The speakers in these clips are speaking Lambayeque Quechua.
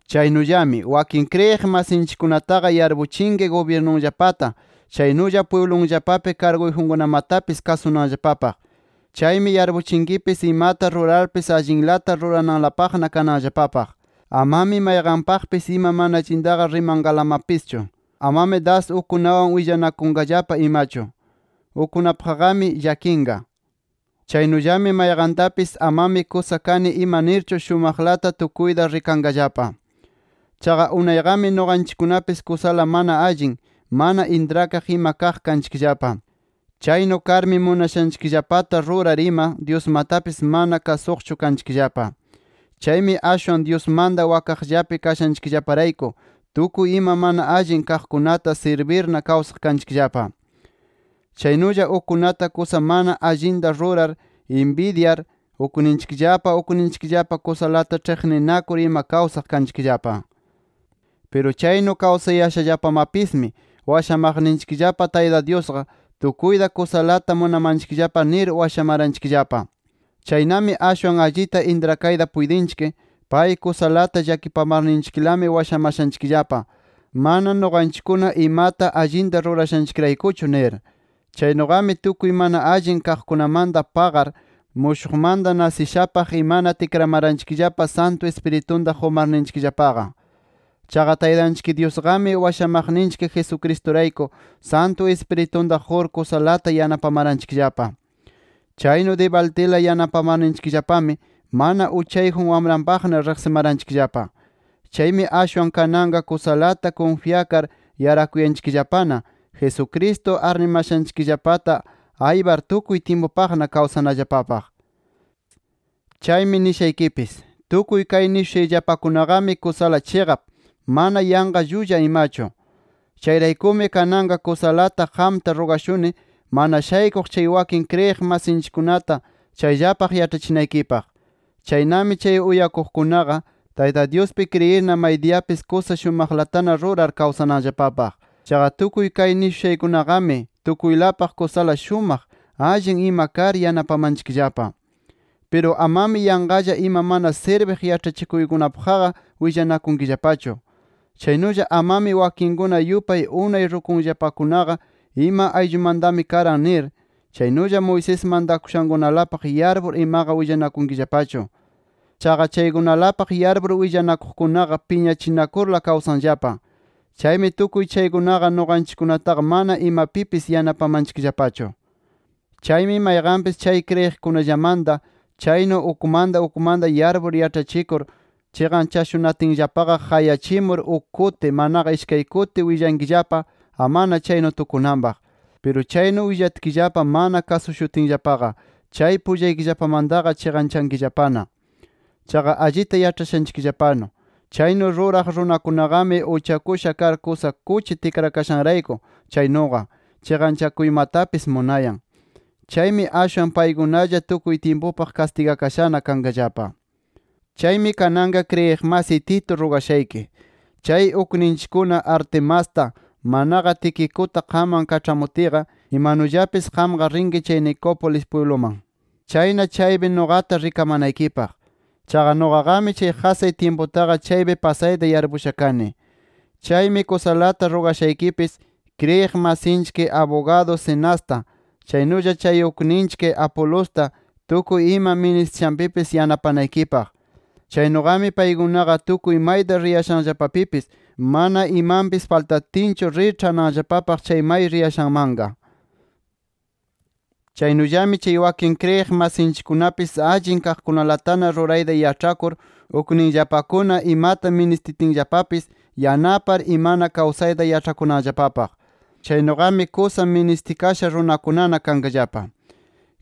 Chaynullami, wakin kriyiq masinchikkunataqa yarpuchinki gubyirnunllapata, chaynulla pwiblunllapapi karguyjunkunamatapis kasunanllapapaq. Chaymi yarpuchinkipis imata rurarpis allinlata rurananlapaqna kananllapapaq. Amami mayqanpaqpis ima mana allintaqa rimanqalamapischu. Amami das ukkunawan willanakunqallapa imachu. Ukkunapaqmi llakinqa. Chaynullami mayqantapis amami kusa kani ima nirchu, shumaqlata tukuyta rikanqallapa. Chaqa unayqami nuqanchikkunapis kusala mana allin, mana intrakaq ima kaq kanchikllapa. Chaynu karmi munashanchikllapata rurar ima, Dyusmatapis mana kasuqchu kanchikllapa. Chaymi ashwan Dyusmanta wakaqllapi kashanchikllaparayku, tukuy ima mana allin kaqkunata sirbirna kawsaq kanchikllapa. Chaynulla ukkunata kusa mana allinta rurar, inbidyar, ukninchikllapa ukninchikllapa kusalata ĉhiqninakur ima kawsaq kanchikllapa. Piru chaynu kawsayashallapamapismi, washamaqninchikllapa Tayta Dyusqa, tukuyta kusalata munamanchikllapa nir washamaranchikllapa. Chaynami ashwan allita intrakayta puytinchik, pay kusalata llakipamarninchiklami washamashanchikllapa, mana nuqanchikkuna imata allinta rurashanchikraykuchu nir. Chaynuqami tukuy mana allin kaqkunamanta paqar, mushuqmanta nasishapaq imana tikramaranchikllapa Santu Ispiritunta qumarninchikllapaqa. Chaqa Taytanchik Dyusqami washamaqninchik Jesucristurayku, Santu Ispiritunta qur kusalata yanapamaranchikllapa. Chaynu dibaldila yanapamarninchikllapami mana uchayjun wamranpaqna riqsimaranchikllapa. Chaymi ashwan kananqa kusalata kunfyakar yarakuyanchikllapana, Jesucristo arnimashanchikllapata aypar tukuy tyimpupaqna kawsanallapapaq. Chaymi nishaykipis: Tukuy kay nishushayllapakunaqami kusala chiqap, mana yanqa llulla imachu. Chayraykumi kananqa kusalata qamta rugashuni, mana shaykuq chay wakin kriyiq masinchikkunata chayllapaq yaĉhachinaykipaq. Chaynami chay uyakuqkunaqa Tayta Dyuspi kriyirna maydiyapis kusa shumaqlatana rurar kawsananllapapaq. Chaqa tukuy kay nishushaykunaqami, tukuylapaq kusala shumaq, allin ima kar yanapamanchikllapa. Piru amami yanqalla ima mana sirbiq yaĉhachikuykunapaqqa willanakunkillapachu. Chaynulla amami wakinkuna yupay unay rukuyllapakunaqa ima ayllumantami karan nir, chaynulla Moisés mantakushankunalapaq yarpur imaqa willanakunkillapachu. Chaqa chaykunalapaq yarpur willanakuqkunaqa piñachikurla kawsanllapa. Chaymi tukuy chaykunaqa nuqanchikkunataqa mana imapipis yanapamanchikllapachu. Chaymi mayqanpis chay kriyiqkunallamanta chaynu ukmanta ukmanta yarpur yaĉhachikur chiqanchashunatinllapaqa qayachimur uk kuti, manaqa ishkay kuti willankillapa amana chaynu tukunanpaq. Piru chaynu willatkillapa mana kasushutinllapaqa, chay pullaykillapamantaqa chiqanchankillapana. Chaqa allita yaĉhashaykillapanu, chaynu ruraq runakunaqami uchakusha kar kusa kuchi tikrakashanrayku chaynuqa chiqanchanakuymatapis munayan. Chaymi ashwan paykunalla tukuy tyimpupaq kastigakashana kanqallapa. Chaymi kananqa kriyiq masiy Tito rugashayki: Chay ukninchikkuna Artemasta, manaqa Tiquicuta qamman kaĉhamutiyqa, imanullapis qamqa rinki chay Nicópolis pwibluman. Chayna chaypi nuqata rikamanaykipaq. Chaqa nuqaqami chay qasay tyimputaqa chaypi pasayta yarpusha kani. Chaymi kusalata rugashaykipis, kriyiq masinchik abugadu Zenasta, chaynulla chay ukninchik Apolosta tukuy ima ministishanpipis yanapanaykipaq. Chaynuqami paykunaqa tukuy mayta riyashanllapapipis mana imanpis faltatinchu rir ĉhananllapapaq chay may riyashanmanqa. Chaynullami chay wakin kriyiq masinchikkunapis allin kaqkunalatana rurayta yaĉhakur, ukninllapakuna imata ministitinllapapis yanapar imana kawsayta yaĉhakunanllapapaq. Chaynuqami kusa ministikasha runakunana kanqallapa.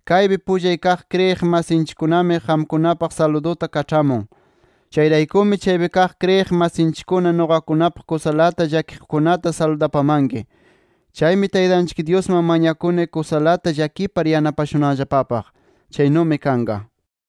Kaypi pullay kaq kriyiq masinchikkunami qamkunapaq saluduta kaĉhamun. Chayraykumi chaypi kaq kriyiq masinchikkuna nuqakunapaq kusalata llakiqkunata saludapamanki. Chaymi Taytanchik Dyusman mañakuni kusalata llakipar yanapashunanllapapaq. Chaynumi kanqa.